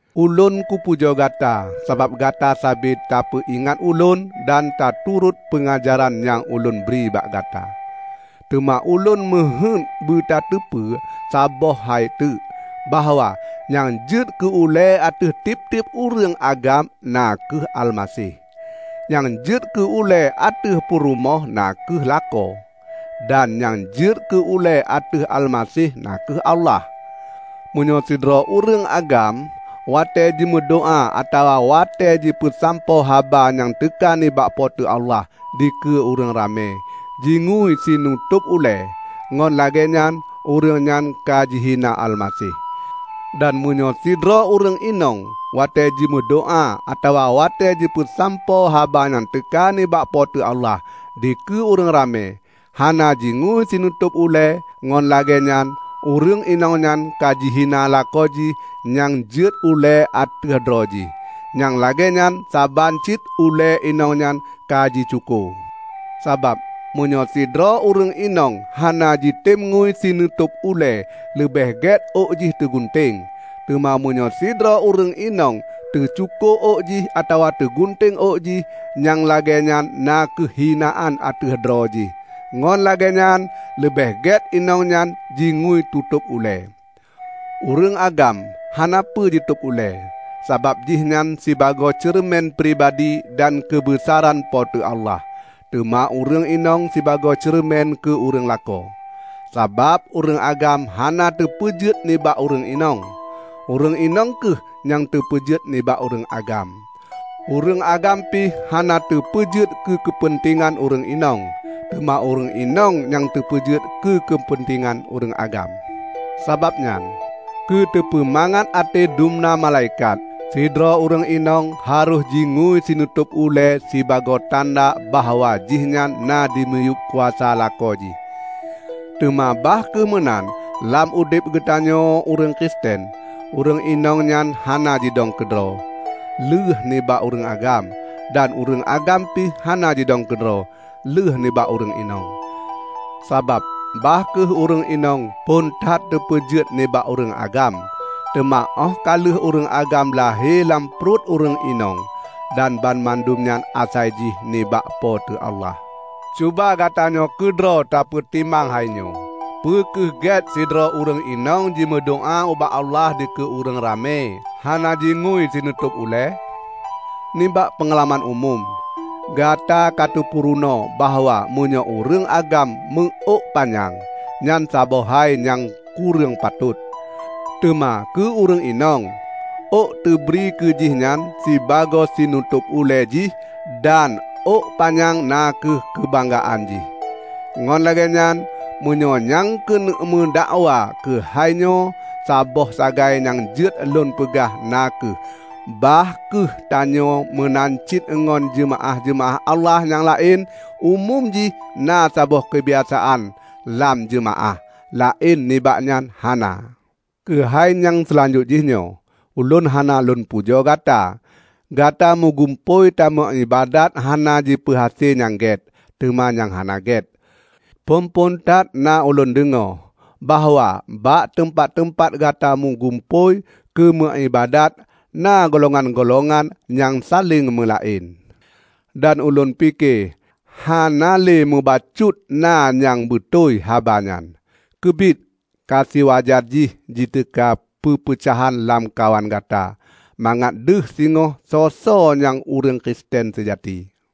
Ulôn kupujoe gata sabab gata sabe tapeuingat ulôn dan taturot peungajaran nyang ulôn bri bak gata. Teuma ulôn meuheuét beutateupeue saboh hai teuk, bahwa nyang jeuet keu ulée ateueh tieb-tieb ureuëng agam na kheueh Almaseh; nyang jeuet keue ulée ateueh purumoh na kheueh lakoe, dan nyang jeuet keue ulée ateueh Almaseh na kheueh Allah. Meunyoe sidroe ureuëng agam watée jimeudoá atawa watée jipeusampoe haba nyang teuka nibak Po teu Allah dikeue ureuëng ramé, jingui sinutôb ulée, ngon lagée nyan ureuëng nyan ka jihina Almaseh. Dan meunyoe sidroe ureuëng inong watée jimeudoá atawa watée jipeusampoe haba nyang teuka nibak Po teu Allah dikeue ureuëng ramé, hana jingui sinutôb ulée, ngon lagée nyan ureuëng inong nyan ka jihina lakoe jih nyang jeuet ulée ateueh droe jih. Nyang lagée nyan saban cit ulée inong nyan ka jicuko. Sabab meunyoe sidroe ureuëng inong hana jitem ngui sinutôb ulée leubeh gét ôk jih teugunteng. Teuma meunyoe sidroe ureuëng inong teucuko ôk jih atawa teugunteng ôk jih, nyang lagée nyan na kheueh hinaan ateueh droe jih. Ngon lagée nyan leubeh gét inong nyan jingui tutôb ulée. Ureuëng agam hana peue jitôb ulée, sabab jihnyan sibagoe ceureumen pribadi dan keubeusaran Po teu Allah. Teuma ureuëng inong sibagoe ceureumen keu ureuëng lakoe, sabab ureuëng agam hana teupeujeuet nibak ureuëng inong, ureuëng inong kheueh nyang teupeujeuet nibak ureuëng agam. Ureuëng agam pih hana teupeujeuet keu keupeuntengan ureuëng inong, teuma ureuëng inong nyang teupeujeuet keu keupeuntengan ureuëng agam. Sabab nyan, keuteupeumangat até dumna malaikat, sidroe ureuëng inong harôh jingui sinutôb ulée sibagoe tanda bahwa jihnyan na dimiyueb kuasa lakoe jih. Teuma bah kheueh meunan lam udeb geutanyoe ureuëng Kristen, ureuëng inong nyan hana jidong keudroe, lheueh nibak ureuëng agam, dan ureuëng agam pih hana jidong keudroe, lheuh nibak ureuëng inong. Sabab bah kheueh ureuëng inong phon that teupeujeuet nibak ureuëng agam, teuma óh ka lheueh ureuëng agam lahé lam pruet ureuëng inong; dan banmandum nyan asai jih nibak Po teu Allah. Cuba gatanyoe keudroe tapeutimang hainyoe: Peu kheueh gét sidroe ureuëng inong jimeudoá ubak Allah dikeue ureuëng ramé, hana jingui sinutôb ulée? Nibak peungalaman umum, gata ka teupeurunoe bahwa meunyoe ureuëng agam meuôk panyang, nyan saboh hai nyang kureueng patôt. Teuma keu ureuëng inong, ôk teubri keu jih nyan sibagoe sinutôb ulée jih dan ôk panyang na kheueh keubanggaan jih. Ngon lagée nyan, meunyoe nyang keuneuk meudakwa keuhai nyoe, saboh sagai nyang jeuet lôn peugah na kheueh bah kheueh tanyoe meunan cit ngon jeumaáh-jeumaáh Allah nyang laén, umum jih na saboh keubiasaan lam jeumaáh; laén nibak nyan hana. Keuhai nyang seulanjutjih nyoe, ulôn hana lôn pujoe gata. Gata meugumpôi tameuiébadat hana jipeuhase nyang gét, teuma nyang hana gét. Phon-phon that na ulôn deungoe, bahwa bak teumpat-teumpat gata meugumpôi keu meuiébadat na golongan-golongan nyang saléng meulaén. Dan ulôn pike hana le meubacut na nyang beutôi haba nyan. Keubiet ka siwajar jih jiteuka peupeucahan lamkawan gata, mangat deuh singoh soe-soe nyang ureuëng Kristen seujati.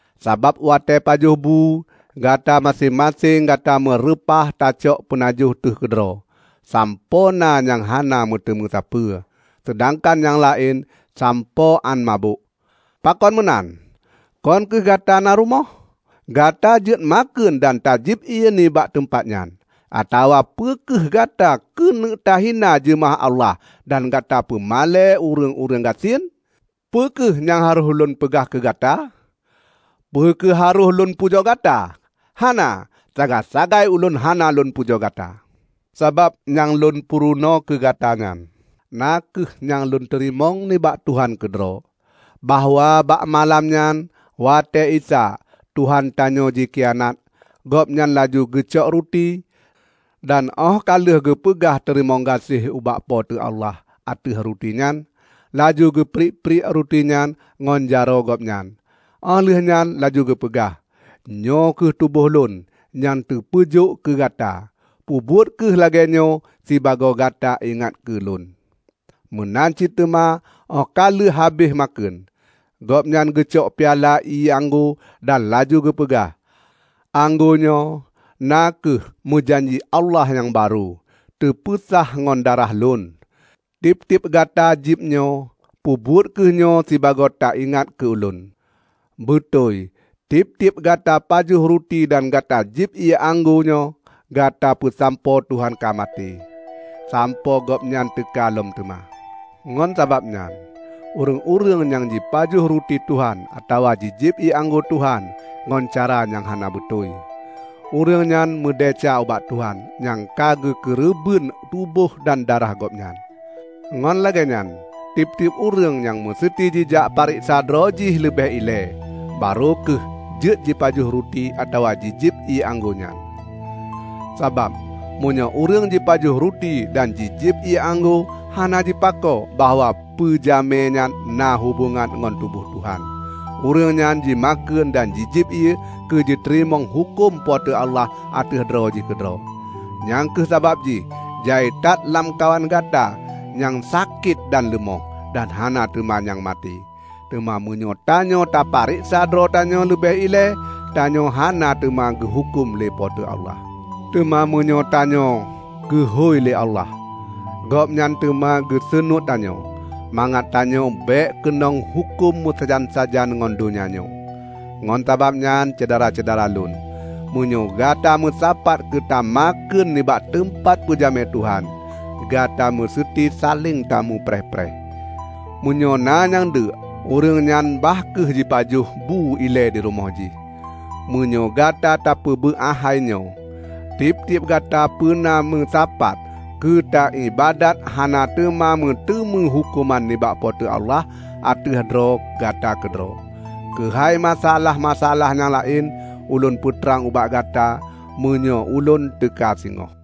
Sabab watée pajoh bu, gata maséng-maséng gata meureupah tacok peunajoh teuh keudroe, sampoe na nyang hana meuteumé sapeue, seudangkan nyang laén sampoe án mabök. Pakon meunan? Kon kheueh Gata na rumoh? Gata jeuet makheun dan tajieb ié nibak teumpat nyan! Atawa peu kheueh gata keuneuk tahina jeumaáh Allah dan gata peumalée ureuëng-ureuëng gasien? Peu kheueh nyang harôh ulôn peugah keu gata? Peu kheueh harôh lôn pujoe gata? Hana! Sagai-sagai ulôn hana lôn pujoe gata. Sabab nyang lôn purunoe keu gata nyan, na kheueh nyang lôn teurimong nibak Tuhan keudroe: bahwa bak malam nyan watée Isa, Tuhan tanyoe jikhianat, Gobnyan laju geucok ruti, dan óh ka lheueh geupeugah teurimong gaséh ubak Po teu Allah ateueh ruti nyan, laju geupriek-priek rutinyan ngon jaroe Gobnyan, óh lheueh nyan laju geupeugah, "Nyoe kheueh tuboh Lôn nyang teupeujôk keu gata. Peubuet kheueh lagée nyoe sibagoe gata ingat keu Lôn." Meunan cit teuma óh ka lheueh habéh makheun, Gobnyan geucok piala ié anggô dan laju geupeugah, "Anggô nyoe na kheueh meujanji Allah nyang barô, teupeusah ngon darah Lôn. Tieb-tieb gata jieb nyoe, peubuet kheueh nyoe sibagoe taingat keu lôn." Beutôi tieb-tieb gata pajoh ruti dan gata jieb ié anggô nyoe, gata peusampoe Tuhan ka maté, sampoe Gobnyan teuka lom teuma. Ngon sabab nyan, ureuëng-ureuëng nyang jipajoh ruti Tuhan atawa jijieb ié anggô Tuhan ngon cara nyang hana beutôi, ureuëng nyan meudesya ubak Tuhan nyang ka geukeureubeuen tuboh dan darah Gobnyan. Ngon lagée nyan, tieb-tieb ureuëng meuseuti jijak peureksa droe jih leubeh ilée, barô kheueh jeuet jipajoh ruti atawa jijieb ié anggô nyan. Sabab meunyoe ureuëng jipajoh ruti dan jijieb ié anggô hana jipako bahwa peujamé nyan na hubongan ngon tuboh Tuhan, ureuëng nyan jimakheun dan jijieb ié keue jiteurimong huköm Po teu Allah ateueh droe jih keudroe. Nyang kheueh sabab jih jai that lamkawan gata nyang sakét dan leumoh, dan na teuma nyang maté. Teuma meunyoe tanyoe tapareksa droe tanyoe leubeh ilée, tanyoe hana teuma geuhuköm lé Po teu Allah. Teuma meunyoe tanyoe geuhôi lé Allah, Gobnyan teuma geuseunuet tanyoe, mangat tanyoe bék keunong huköm meusajan-sajan ngon donya nyoe. Ngon sabab nyan, Syedara-syedara lôn, meunyoe gata meusapat keu tamakheun nibak teumpat peujamé Tuhan, gata meuseuti saléng tamupreh-preh. Meunyoe na nyang deuk, ureuëng nyan bah kheueh jipajoh bu ilée dirumoh jih. Meunyoe gata tapeubeuah hai nyoe, tieb-tieb gata peuna meusapat keu taiébadat hana teuma meuteumé huköman nibak Po teu Allah ateueh droe gata keudroe. Keuhai masa-alah-masa-alah nyang laén, ulôn peutrang ubak gata, meunyoe ulôn teuka singoh.